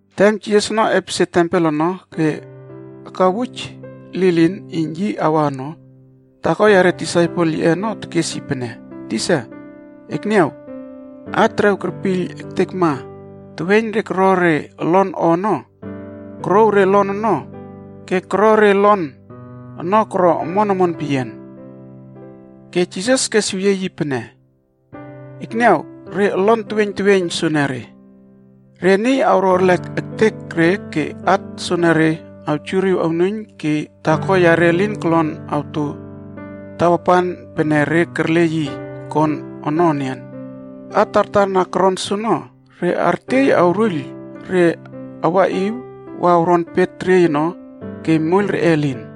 Tem Jisas ono epesie tempel ono ke akawuj lilin iyn yi awa ono, taako yare disaipel yiꞌe ono tekes yi pene, “Tisa, ekniaw, at terew kerpiyl ektekma teweiyn re koro re olon o ono, korouw re olon ono ke koro re olon ono koro omon omon peyian.” Ke Jisas kesweyie yi pene, “Ekniaw re olon teweiyn teweiyn soenere. Re niy awro arlek eketek re ke at soenere awjuriw onuiyn ke taako yare elin kolon awto tawapan pene re kerle yi kon ono enian. At tartar na koron soono, re artiey awruiyl re awaꞌiw wa awron pet teriey ono ke moiyl reꞌe elin.”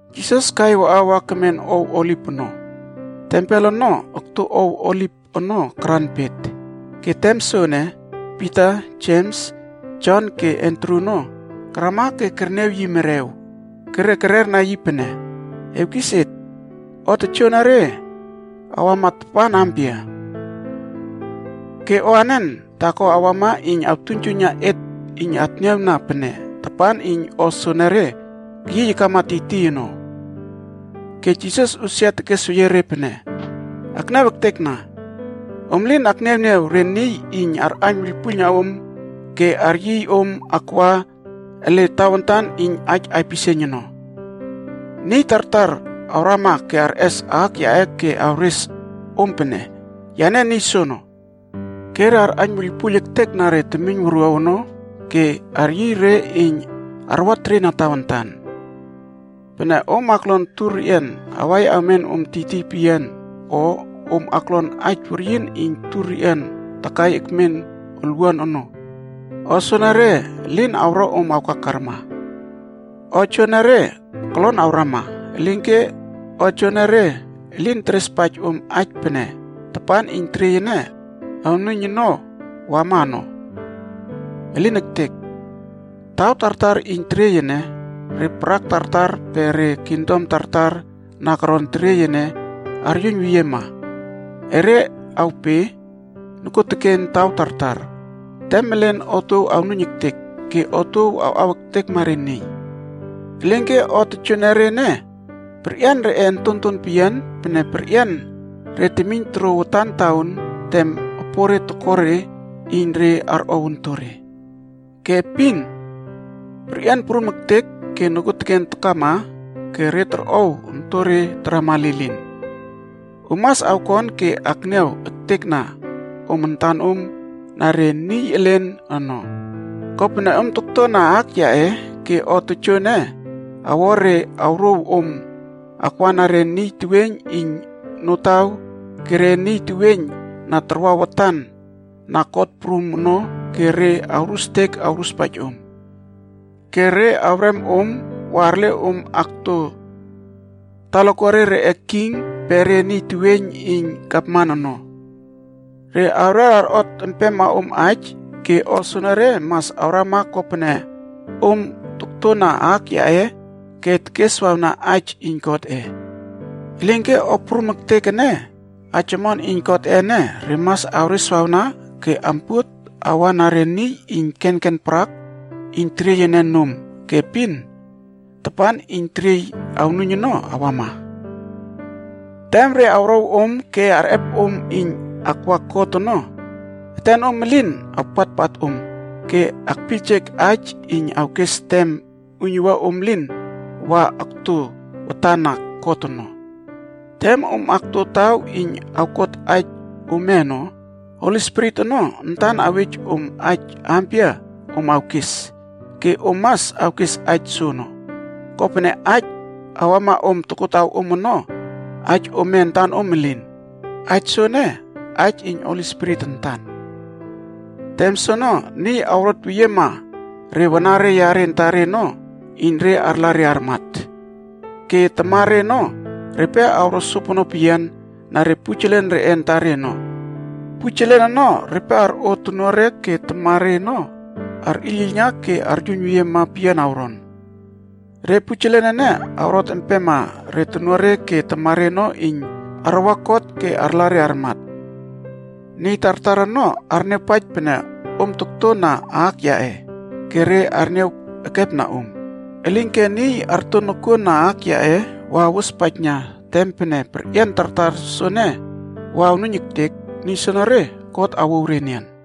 Jisas kai waꞌa wa kemen ow Oliv ono. Tempel ono okto ow Oliv ono karan pet. Ke tem soene, Pita, Jems, Jon ke Andru ono karama ke kerniaw yi merew. Ke re kererna yi pene, “Ewkis et, o tojoenere awama tapan ampia? Ke o anen taako awama iyn awtuiynjuiyna et iyn atniawna pene tapan iyn o soenere keyiy akama tiytiy ono?” Ke Jisas usia tekesweyie re pene, “Akniaw ektekna. Om lin akniawniaw re niy iyn arꞌaiyn wuiylpuiylna om ke aryiy om akwa ele tawantan iyn aij aipisieiyn ono. Niy tartar awrama ke arꞌes aak yaꞌe ke awres om pene, ‘Yane niy soono,’ ke re arꞌaiyn wuiylpuiyl ektekna re temiyn wuruaw ono ke aryiy re iyn arwateriena tawantan. “Pene om oklon tur reꞌian awai awmen om tiytiy peyian o om aklon aij weryin iyn tur reꞌian takai ekmen olwuan ono, o soenere elin awro om awkakarma. O joenere kolon awrama, elinke o joenere elin terespaij om aij pene tapan iyn teriey ene awnuiyn ono wama ono. Elin ektek! Taw tartar iyn teriey ene, re parak tartar pe re kingdom tartar na koron teriey ene aryuiyn weyiema. Erre awpe nokuoteken taw tartar. Tem elen otuow awnuiyn ektek ke otuow awꞌaw ektekma re niy. Elinke o tojoenere ene, re o perꞌian reꞌe ontonton peyian pene perꞌian re temiyn torouw watan taon tem opore toko re iyn re arꞌep ontore. Ke epin perꞌian prum ektek ke nokuoteken takama ke re torꞌow ontonre tarama lilin.” “Om mas awkon ke akniaw ektekna om antanom na re niy elen ono. Kopene om toktona aak yaꞌe ke o tojoene awo re awrouw om akwana re niy teweiyn iyn notaw ke re niy teweiyn na tarwa watan na kot prum ono ke re awrustek awruspaij om. Ke re awrem om wa arle om akto talakuare reꞌe king pe re niy teweiyn iyn gavman ono. Re awrer arꞌot empema om aij ke o soenere mas awrama kopene om toktona aak yaꞌe ke tekeswawna aij iyn Godꞌe. Elinke o prum ektek ene, aij omon iyn Godꞌe ene re mas awreswawna ke ampuot awana re niy iyn kenken parak iyn teriey ene nom ke epin, tapan iyn teriey awnuiyn ono, awama. Tem re awrow om ke arꞌep om iyn akwa kot ono, etenom elin awpatpat om ke akpiyljek aij iyn awkes tem uiynuwua om lin wa okto watana kot ono. Tem om akto taw iyn awkot aij ome ono, Holi Spirit ono antan awej om aij ampia om awkes ke om mas awkes aij soono, kopene aij awama om tokotawom ono, aij ome antanom elin. Aij soono, aij iyn Holi Spirit antan.” “Tem soono, niy awrot weyiema re wanare yare antare ono iyn re arla re armat. Ke tamare ono, repe awro sopono peyian na re pujelen reꞌe antare ono. Pujelen ono repe arꞌo tonuare ke tamare ono arꞌiylꞌiylna aryuiynyuiyna peyian awron. Re pujelen ene awrot empema re tonuare ke tamare ono iyn arwa kot ke arla re armat. Niy tartar ono arniawpaij pene om tokto na aak yaꞌe ke re arniaw ekepna om. Elinke niy arto nokuon na aak yaꞌe wa awospaijna tem pene perꞌian tartar soene wa awnuiyn ektek, niy soonore God awouw re enian.”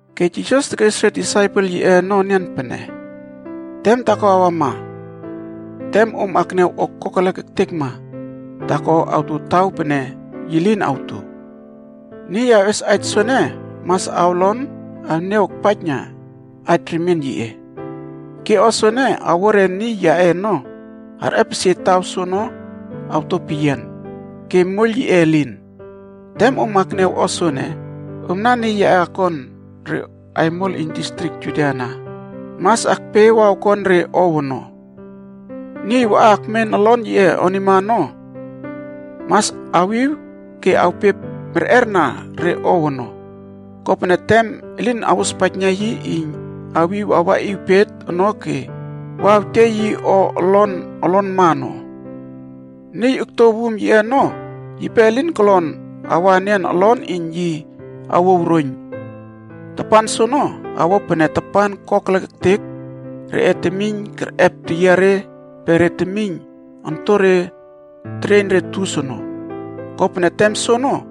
Ke Jisas tekes re disaipel yiꞌe ono enian pene, “Tem taako awama tem om akniaw o kokelek ektekma taakoa awto taw pene yi lin awto.” Niy awꞌes aij soene mas awlon awniaw akpaij aij remien yiꞌe. “Ke o soene awo re niy yaꞌe ono arꞌepesie taw soono awto peyian ke moiyl yiꞌe elin. Tem om akniaw o soene, omna niy yaꞌe akon re aimol iyn distrik Judia ana, mas akpe wa awkon re ow ono. Niy waꞌa akmen olon yiꞌe onima ono, mas awiw ke awpe merꞌerna re ow ono. Kopene tem elin awospaijna yi iyn awiw awaꞌiw pet ono ke wa awtiey yi o olon olonma ono. Niy okto wum yiꞌe ono, yipe lin kolon awa enian olon iyn yi awow roiyn. Tapan soono, awo pene tapan kokelek ektek reꞌe temiyn kerꞌep teyiare pe re temiyn ontonre tereiyn re tus ono. Kopene tem soono,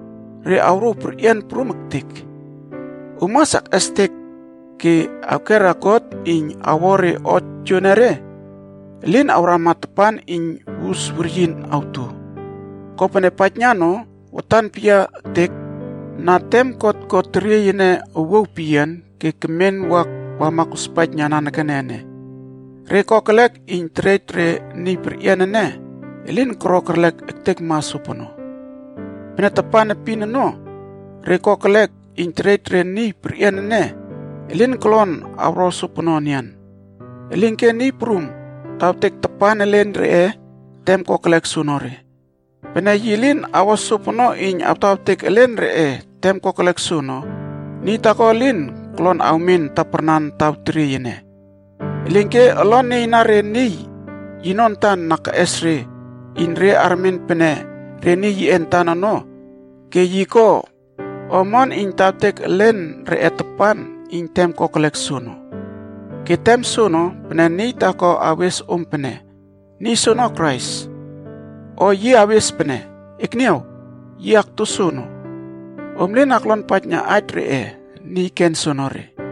re awrouw perꞌian prum ektek. Om mas akꞌestek ke awkera God iyn awo re o joenere elin awrama tapan iyn wus weryin awto. Kopene paijna no, watan peyia ektek na tem God ko teriey ene owuaw peyian ke kemen wa wama kospaijna nanekene ene, re kokelek iyn terej re niy perꞌian ene elin koro kerlek ektekma sopono. Pene tapan epin ono, re kokelek iyn terej re niy perꞌian ene, elin kolon awro sopono enian. Elinke Niy Prum tawtek tapan elen reꞌe tem kokelek soonore. Pene yi lin awo sopono iyn awtawtek elen reꞌe tem kokelek soono, niy taako elin kolon awmen taparnan taw teriey ene. Elinke olon nieiyna re niy yino antan na keꞌes re iyn re armen pene re niy yiꞌe antan ono ke yi ko o omon iyn tawtek elen reꞌe tapan iyn tem kokelek soono.b “Ke tem soono, pene niy taako awes om pene, ‘Niy soono Krais,’ o yi awes pene ‘Ekniaw, yi okto soono.’ Om lin aklonpaijna aij reꞌe niy ken soenere.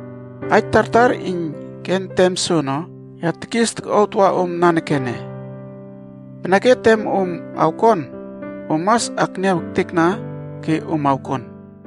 Aij tartar iyn ken tem soono, ya tekis tokꞌuaw tawa om nanekene. Peneke tem om awkon, om mas akniaw ektekna ke om awkon.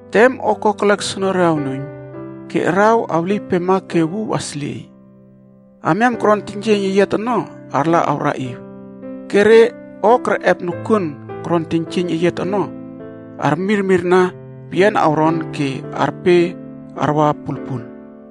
“Tem o kokelek soonore awnuiyn, ‘ke araw awlieypema ke wuw aslieiy. Amiam koron teiynjieiyn eyiat ono arla awraꞌiw, ke re o kerꞌep nokuon koron teiynjieiyn eyiat onoc armirmirna peyian awron ke arpe arwa pulpul.’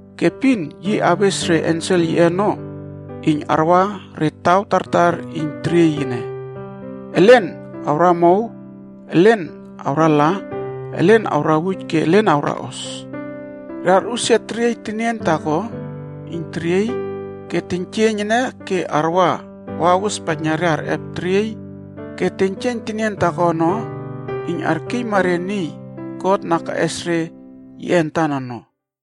Ke epin yi awes re ensel yiꞌe ono iyn arwa re taw tartar iyn teriey ene. Elen awramow, elen awrala, elen awrawuj ke elen awraꞌos. Re arꞌusia teriey tenien taako iyn teriey ke teiynjieiyn ene ke arwa wa awospaijna re arꞌep teriey ke teiynjieiyn tenien taako ono iyn arkiyma re niy God na keꞌes re yiꞌe antan ono.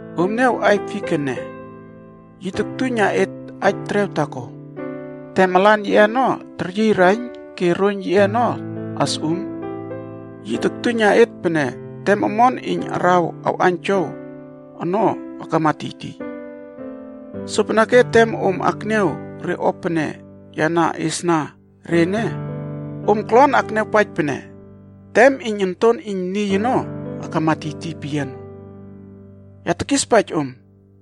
“Om niaw aiy fik ene. Yi toktuiyna et aij terew taako. Tem alan yiꞌe ono teryiy raiyn ke roiyn yiꞌe ono asꞌum, yi toktuiyna et pene tem omon iyn araw awꞌaiynjow ono akama tiytiy. Sopeneke tem om akniaw re o pene ya na iesna re ene, om kolon akniawpaij pene tem Onton Iyn Niy ono akama tiytiy peyian ono. Ya tekispaij om,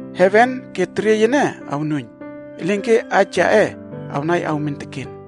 Heven ke teriey ene awnuiyn. Elinke aij yaꞌe awnai awmen teken.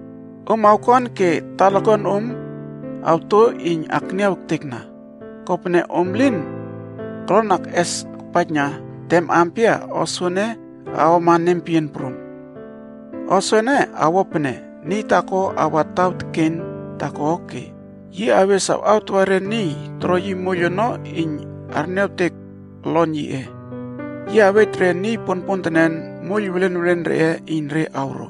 “Om awkon ke talakuanom awto iyn akniaw ektekna, kopene om elin kolon akꞌes akpaijna tem ampia o soene awama nempeyian prum. O soene awo pene niy taako awa taw teken taako ke yi awkes awawtawa re niy toro yi moiyl ono iyn arniawtek olon yiꞌe. Yi awej re niy ponpontenen moiyl welen welen reꞌe iyn re awro.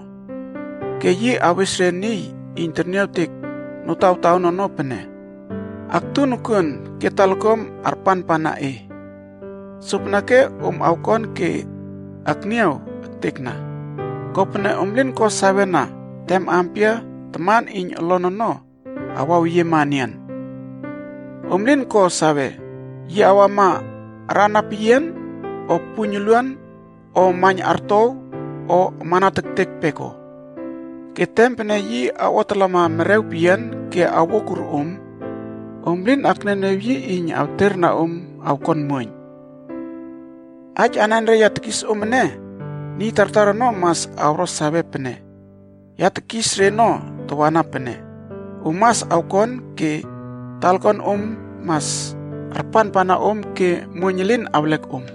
Ke yi awes niy iyn tekniawtek notawtaon ono pene, ‘Aktu nokuon ke talakuam arpanpana e.’ “Sopeneke om awkon ke akniaw ektekna. Kopene om lin ko sawena tem ampia taman iyn olon ono awaweyiema enian. Om lin ko sawe, yi awama arana peyian, o puiyn uluan, o maiyn artow o amana tektek peko. Ke tem pene yi awꞌotalama merew peyian ke awokur om, om lin akniawniaw yi iyn awterna om awkuon muoiyn. Aij anenre ya tekis om ene, niy tartar ono mas awro sawe pene ya tekis reno tawana pene, ‘Om mas awkon ke talakuanom mas arpanpana om ke muoiyn elin awlek om.’”